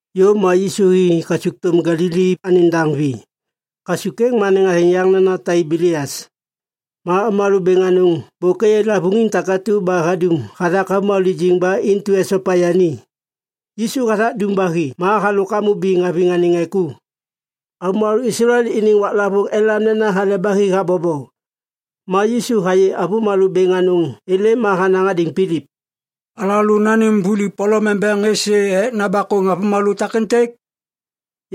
Yôv ma Yisu hi kasukthôm Galili anêŋ daŋ vi. Kasuk êŋ anêŋ athêŋ yaŋ nena Taibelias. Ma avômalô bêŋ anôŋ bôk êyê lavôŋiŋ takatu ba hadum hathak avômalô lijiŋ ba intu esopa yani. Yisu hathak dum ba hi ma halôk hamô biŋ haviŋ anêŋ ŋê ku. Avômalô Islael iniŋ waklavôŋ elam nena Hale ba Hi habobo. Ma Yisu hayê avômalô bêŋ anôŋ êlêm ma hanaŋ hadêŋ Pilip, “Alalô nanêm vuli polom embeŋ êsê ek nabakôŋ avômalô takêntêk?”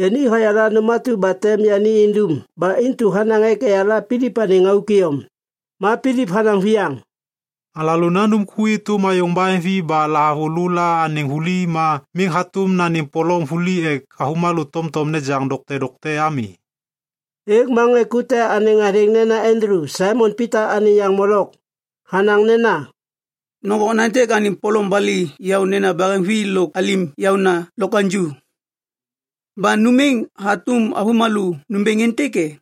Yani hayala nôm atu ba tem yani indum ba intu hanaŋ ek eyala Pilip anêŋ auk iyom. Ma Pilip hanaŋ viyaŋ, “Alalô nandum ku êtôm ayôŋ baheŋvi ba lahavulô la anêŋ vuli ma miŋ hatôm nanêm polom vuli ek avômalô tomtom nejaŋ dokte dokte ami!” Êŋ ma ŋê ku te anêŋ athêŋ nena Andulu, Saimon Pita anêŋ yaŋ molok, hanaŋ nena, “Nôŋgô okna êntêk anêŋ polom bali yaônena baheŋvi lôk alim yaôna lokwaŋju. Ba nôm êŋ hatôm avômalô nômbêŋ êntêk e?”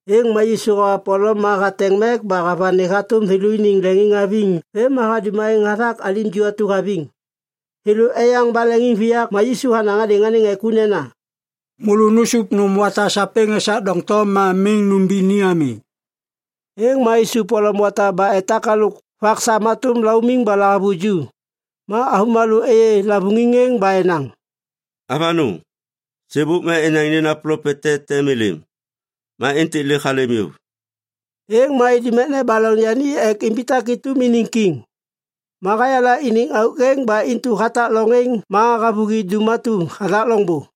Êŋ ma Yisu hawa polom ma hateŋ mek ba havani hatôm thêlôniŋ leŋiŋhaviŋ vêm ma hadum aêŋ hathak alim ju atu haviŋ. Thêlô eyaŋ ba leŋiŋviyak ma Yisu hanaŋ hadêŋ anêŋ ŋê ku nena, “Môlô nusup nôm wata sapêŋ esak doŋtom ma miŋ nômbi ni ami.” Êŋ ma isup polom wata ba etak halôk vak sam hatôm laumiŋ ba lahavuju. Ma avômalô êyê lavôŋiŋ êŋ ba enaŋ, “Avanôŋ! Sêbôk ma enaŋ nena plopet te tem êlêm. Ma êntêk lêk halêm yôv.” Êŋ ma idum ek nebaloŋ yani ek imbitak êtôm iniŋ kiŋ. Ma hayala iniŋ auk êŋ, ba intu hatak loŋ êŋ ma havôhi dum atu hathak loŋbô.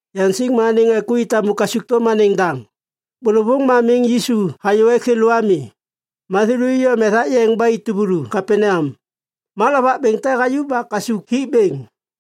Yaŋsiŋ ma anêŋ ŋê ku i tamu kasukthôm anêŋ daŋ. Bôlôvôŋ ma miŋ Yisu hayô ek thêlô ami. Ma thêlô iyom ethak yeŋ ba i tuvulu Kapaneam. Ma lovak bêŋ te hayuv ba kasuk hik bêŋ.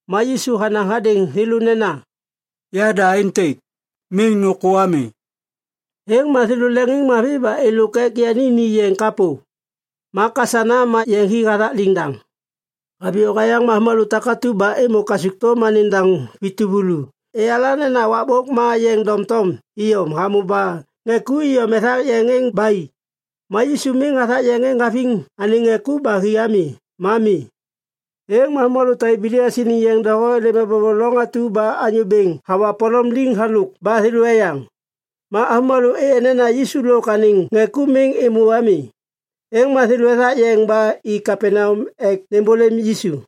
Ma Yisu hanaŋ hadêŋ thêlô nena, “Yada êntêk! Miŋ nôkô ami.” Êŋ ma thêlô leŋiŋmavi ba êlôk ek yani ni yeŋ kapô. Ma kasana ma yeŋ hi hathak liŋdaŋ. Haviyô hayaŋ ma avômalô takatu ba êmô kasukthôm anêŋ daŋ vi tuvulu eyala nena wakbôk ma yeŋ doŋtom iyom hamô ba ŋê ku iyom ethak yeŋ êŋ ba i. Ma Yisu miŋ hathak yeŋ êŋ haviŋ anêŋ ŋê ku ba hi ami ma mi. Êŋ ma avômalô Taibelias iniŋ yeŋ doho êlêm ebobo loŋ atu ba Anyô Bêŋ hava polom liŋ halôk ba thêlô eyaŋ. Ma avômalô êyê nena Yisu lôk anêŋ ŋê ku miŋ êmô ami. Êŋ ma thêlô ethak yeŋ ba i Kapaneam ek nêmbôlêm Yisu.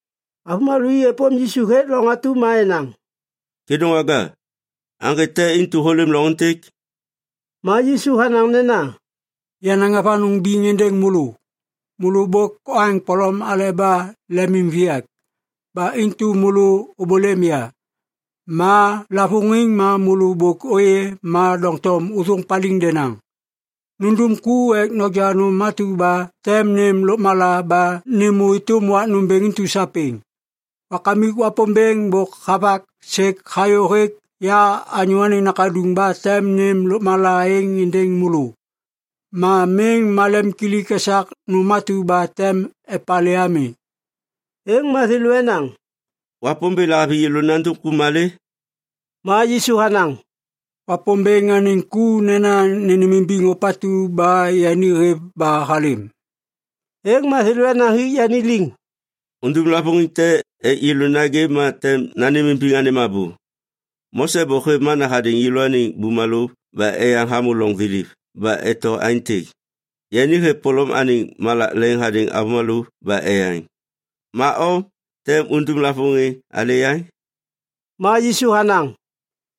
Avômalô i êpôm Yisu hêk loŋ atu ma enaŋ, “Kêdôŋwaga, aŋgê te intu hôlêm loŋ êntêk?” Ma Yisu hanaŋ nena, “Yanaŋ avanôŋ biŋ êndêŋ môlô. Môlô bôk oaŋ polom aleba lemimviyak. Ba intu môlô ôbôlêm ya. Ma lavôŋiŋ ma môlô bôk ôyê ma doŋtom ôthôŋ paliŋ denaŋ. Nundum ku ek noja nôm atu ba tem nêm lôkmala ba nêmô êtôm wak nômbêŋ intu sapêŋ. Wakamik Wapômbêŋ bôk havak sêk hayô hêk ya Anyô Anêŋ Nakaduŋ ba tem nêm lôkmala êŋ êndêŋ môlô. Ma miŋ malemkilik esak nôm atu ba tem epalê ami!” Êŋ ma thêlô enaŋ, “Wapômbêŋ lahaviŋ yêlô nandum ku malê?” Ma Yisu hanaŋ, “Wapômbêŋ anêŋ ku nena nônêmimbiŋ ôpatu ba yani hêv ba halêm.” Êŋ ma thêlô enaŋ hik yani liŋ, “Undum lavôŋiŋ te ek yêlô nagê ma tem nanêmimbiŋ anêm abô. Mose bôk hêv mana hadêŋ yêlôaniŋ bumalô ba eyaŋ hamô loŋ thiliv ba eto aêntêk, ‘Yani hêv polom anêŋ malak leŋ hadêŋ avômalô ba eyaŋ.’ Ma o, tem undum lavôŋiŋ alê yaŋ?” Ma Yisu hanaŋ,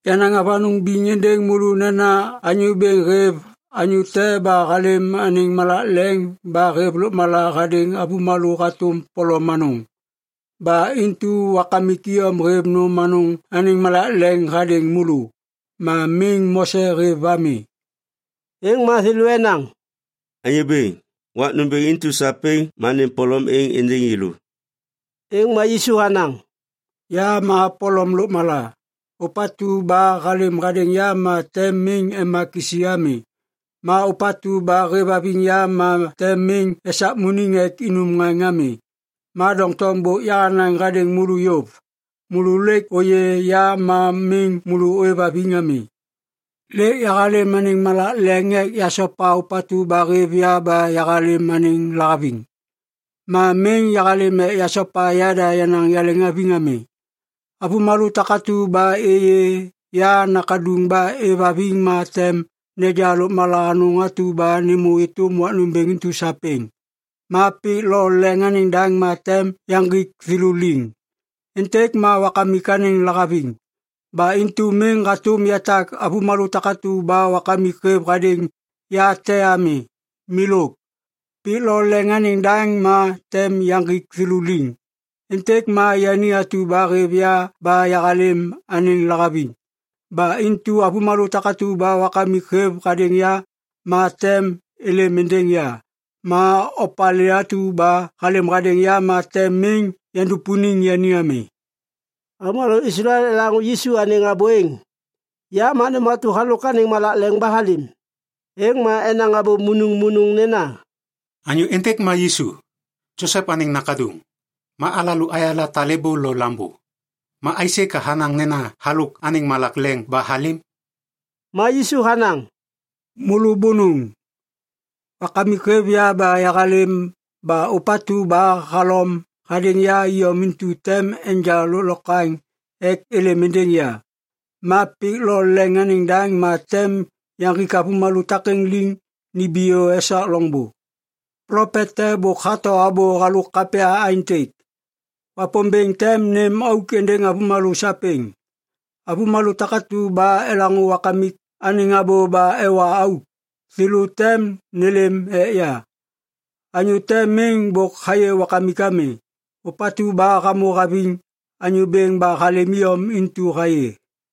“Yanaŋ avanôŋ biŋ êndêŋ môlô nena Anyô Bêŋ hêv anyô te ba halêm anêŋ malak leŋ ba hêv lôkmala hadêŋ avômalô hatôm polom anôŋ. Ba intu Wakamik iyom hêv nôm anôŋ anêŋ malak leŋ hadêŋ môlô. Ma miŋ Mose hêv ami.” Êŋ ma thêlô enaŋ, “Anyô Bêŋ, wak nômbêŋ intu sapêŋ ma nêm polom êŋ êndêŋ yêlô.” Êŋ ma Yisu hanaŋ, “Ya ma polom lôkmala. Ôpatu ba halêm hadêŋ ya ma tem miŋ ema kisi ami. Ma ôpatu ba hêvhaviŋ ya ma tem miŋ esakmuniŋ ek inum ŋaŋ ami. Ma doŋtom bôk yahanaŋ hadêŋ môlô yôv. Môlô lêk ôyê ya ma miŋ môlô ôêvhaviŋ ami. Lêk yahalêm anêŋ malak leŋ ek yasopa ôpatu ba hêv ya ba yahalêm anêŋ lahaviŋ. Ma miŋ yahalêm ek yasopa yada yenaŋ yaleŋhaviŋ ami. Avômalô takatu ba êyê ya Nakaduŋ ba êvhaviŋ ma tem neja lôkmala anôŋ atu ba nêmô êtôm wak nômbêŋ intu sapêŋ. Ma pik lo leŋ anêŋ daŋ ma tem yaŋgik thêlô liŋ. Êntêk ma Wakamik anêŋ lahaviŋ. Ba intu miŋ hatôm yatak avômalô takatu ba Wakamik hêv hadêŋ ya te ami. Milôk. Pik lo leŋ anêŋ daŋ ma tem yaŋgik thêlô liŋ. Êntêk ma yani atu ba hêv ya ba yahalêm anêŋ lahaviŋ. Ba intu avômalô takatu ba Wakamik hêv hadêŋ ya ma tem nêlêm êndêŋ ya. Ma opalê atu ba halêm hadêŋ ya ma tem miŋ yandupuniŋ yani ami.” Avômalô Islael elaŋô Yisu anêŋ abô êŋ “Ya ma nôm atu ba halôk anêŋ malak leŋ ba halêm.” Êŋ ma enaŋ abô munuŋmunuŋ nena, “Anyô êntêk ma Yisu, Josep anêŋ nakaduŋ! Ma alalô ayala talêbô lo lambô! Ma aisê ka hanaŋ nena halôk anêŋ malak leŋ ba halêm?” Ma Yisu hanaŋ, “Môlô bônôŋ! Wakamik hêv ya ba yahalêm ba ôpatu ba halom hadêŋ ya iyom intu tem enja lôklokwaŋ ek êlêm êndêŋ ya. Ma pik lo leŋ anêŋ daŋ ma tem yaŋgik avômalô takêŋ liŋ nimbiyô esak loŋbô. Plopet te bôk hato abô halôk kapya aêntêk, “‘Wapômbêŋ tem nêm auk êndêŋ avômalô sapêŋ.’ Avômalô takatu ba elaŋô Wakamik anêŋ abô ba ewa auk, thêlô tem nêlêm ek ya. Anyô te miŋ bôk hayê Wakamik ami. Ôpatu ba hamô haviŋ Anyô Bêŋ ba halêm iyom intu hayê.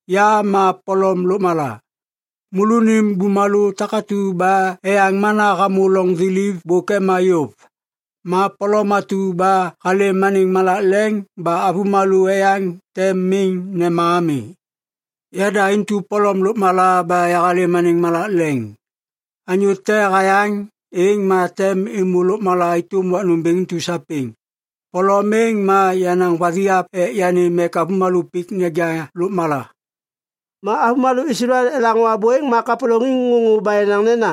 Ya ma polom lôkmala. Môlônim bumalô takatu ba eyaŋ mana hamô loŋ thiliv bôk ema yôv. Ma polom atu ba halêm anêŋ malak leŋ ba avômalô eyaŋ tem miŋ nema ami. Yada intu polom lôkmala ba yahalêm anêŋ malak leŋ. Anyô te hayaŋ, êŋ ma tem êmô lôkmala êtôm wak nômbêŋ intu sapêŋ. Polom êŋ ma yenaŋ vathiap ek yanêm ek avômalô pik neja lôkmala.” Ma avômalô Islael elaŋô abô êŋ ma kapôlôŋiŋ ŋôŋô ba enaŋ nena,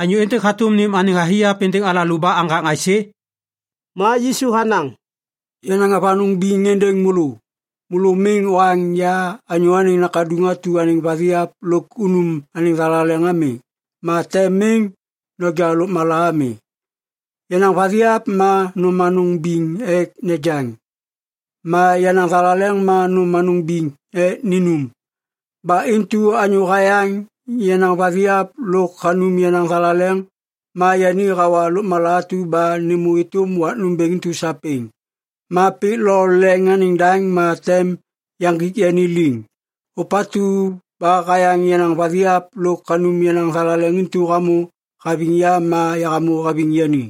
“Anyô êntêk hatôm nêm anêŋ vathiap êndêŋ alalô ba aŋgaŋ aisê?” Ma Yisu hanaŋ, “Yanaŋ avanôŋ biŋ êndêŋ môlô. Môlô miŋ oaŋ ya Anyô Anêŋ Nakaduŋ atu anêŋ vathiap lôk unum anêŋ thalaleŋ ami, ma tem miŋ noja lôkmala ami. Yenaŋ vathiap ma nôm anôŋ biŋ ek nejaŋ, ma yenaŋ thalaleŋ ma nôm anôŋ biŋ ek ninum. Ba intu anyô hayaŋ yenaŋ vathiap lôk hanum yenaŋ thalaleŋ ma yani hawa lôkmala atu ba nêmô êtôm wak nômbêŋ intu sapêŋ. Ma pik lo leŋ anêŋ daŋ ma tem yaŋgik yani liŋ. Ôpatu ba hayaŋ yenaŋ vathiap lôk hanum yenaŋ thalaleŋ intu hamô haviŋ ya ma yahamô haviŋ yani.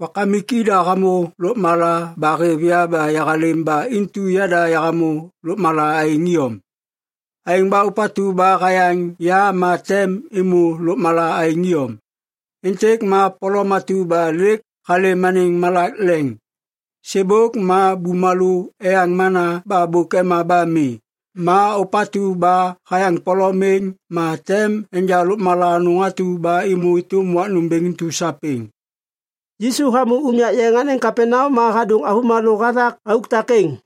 Wakamik ida hamô lôkmala ba hêv ya ba yahalêm ba intu yada yahamô lôkmala aêŋ iyom. Aêŋ ba ôpatu ba hayaŋ ya ma tem êmô lôkmala aêŋ iyom. Êntêk ma polom atu ba lêk halêm anêŋ malak leŋ. Sêbôk ma bumalô eyaŋ mana ba bôk ema ba mi. Ma ôpatu ba hayaŋ polom êŋ, ma tem enja lôkmala anôŋ atu ba êmô êtôm wak nômbêŋ intu sapêŋ.” Yisu hamô unyak yeŋ anêŋ Kapaneam ma hadôŋ avômalô hathak auk takêŋ.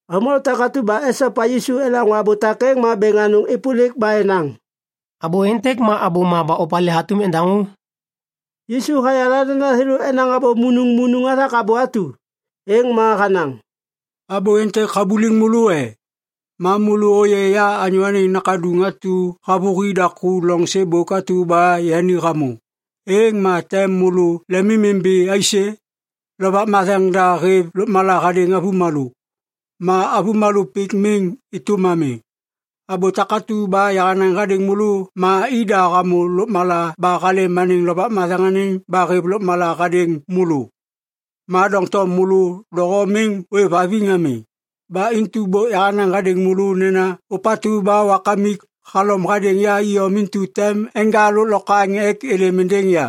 Avômalô takatu ba esopa Yisu elaŋô abô takêŋ ma bêŋ anôŋ êpôlik ba enaŋ, “Abô êntêk ma abôma ba opalê hatôm endaŋô?” Yisu hayala nena thêlô enaŋ abô munuŋmunuŋ hathak abô atu. Êŋ ma hanaŋ, “Abô êntêk habuliŋ môlô e? Ma môlô ôyê ya Anyô Anêŋ Nakaduŋ atu havôhi daku loŋ sêbôk atu ba yani hamô, êŋ ma tem môlô lemimimbi aisê? Lovak Matheŋ da hêv lôkmala hadêŋ avômalô. Ma avômalô pik miŋ êtôm ami. Abô takatu ba yahanaŋ hadêŋ môlô ma ida hamô lôkmala ba halêm anêŋ Lovak Matheŋ ba hêv lôkmala êŋ hadêŋ môlô. Ma doŋtom môlô doho miŋ ôêvhaviŋ ami. Ba intu bôk yahanaŋ hadêŋ môlô nena ôpatu ba Wakamik halom hadêŋ ya iyom intu tem enja lôklokwaŋ ek êlêm êndêŋ ya.”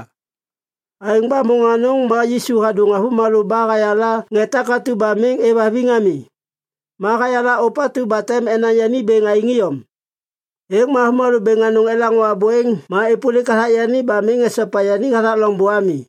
Aêŋ ba môŋ anôŋ ma Yisu hadôŋ avômalô ba hayala ŋê takatu ba miŋ êvhaviŋ ami. Ma hayala ôpatu ba tem enaŋ yani bêŋ aêŋ iyom. Êŋ ma avômalô bêŋ anôŋ elaŋô abô êŋ ma êpôlik hathak yani ba miŋ esopa yani hathak loŋbô ami.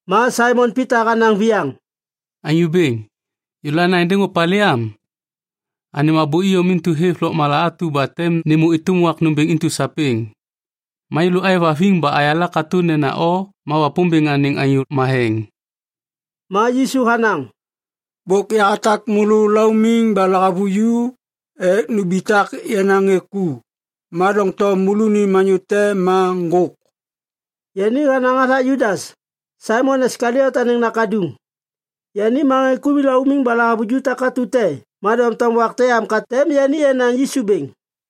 Ma Saimon Pita hanaŋ viyaŋ, “Anyô Bêŋ, yêlô ana êndêŋ opalê am? Anêm abô iyom intu hêv lôkmala atu ba tem nêmô êtôm wak nômbêŋ intu sapêŋ. Ma yêlô êvhaviŋ ba ayala katô nena o ma Wapômbêŋ anêŋ Anyô Matheŋ.” Ma Yisu hanaŋ, “Bôk yahatak môlô laumiŋ ba lahavuju ek numbitak yenaŋ ŋê ku. Ma doŋtom môlônim anyô te ma ŋgôk.” Yani hanaŋ hathak Judas, Saimon Iskaliot anêŋ nakaduŋ. Yani ma ŋê ku laumiŋ ba lahavuju takatu te ma doŋtom wak te am ka tem yani enaŋ Yisu bêŋ.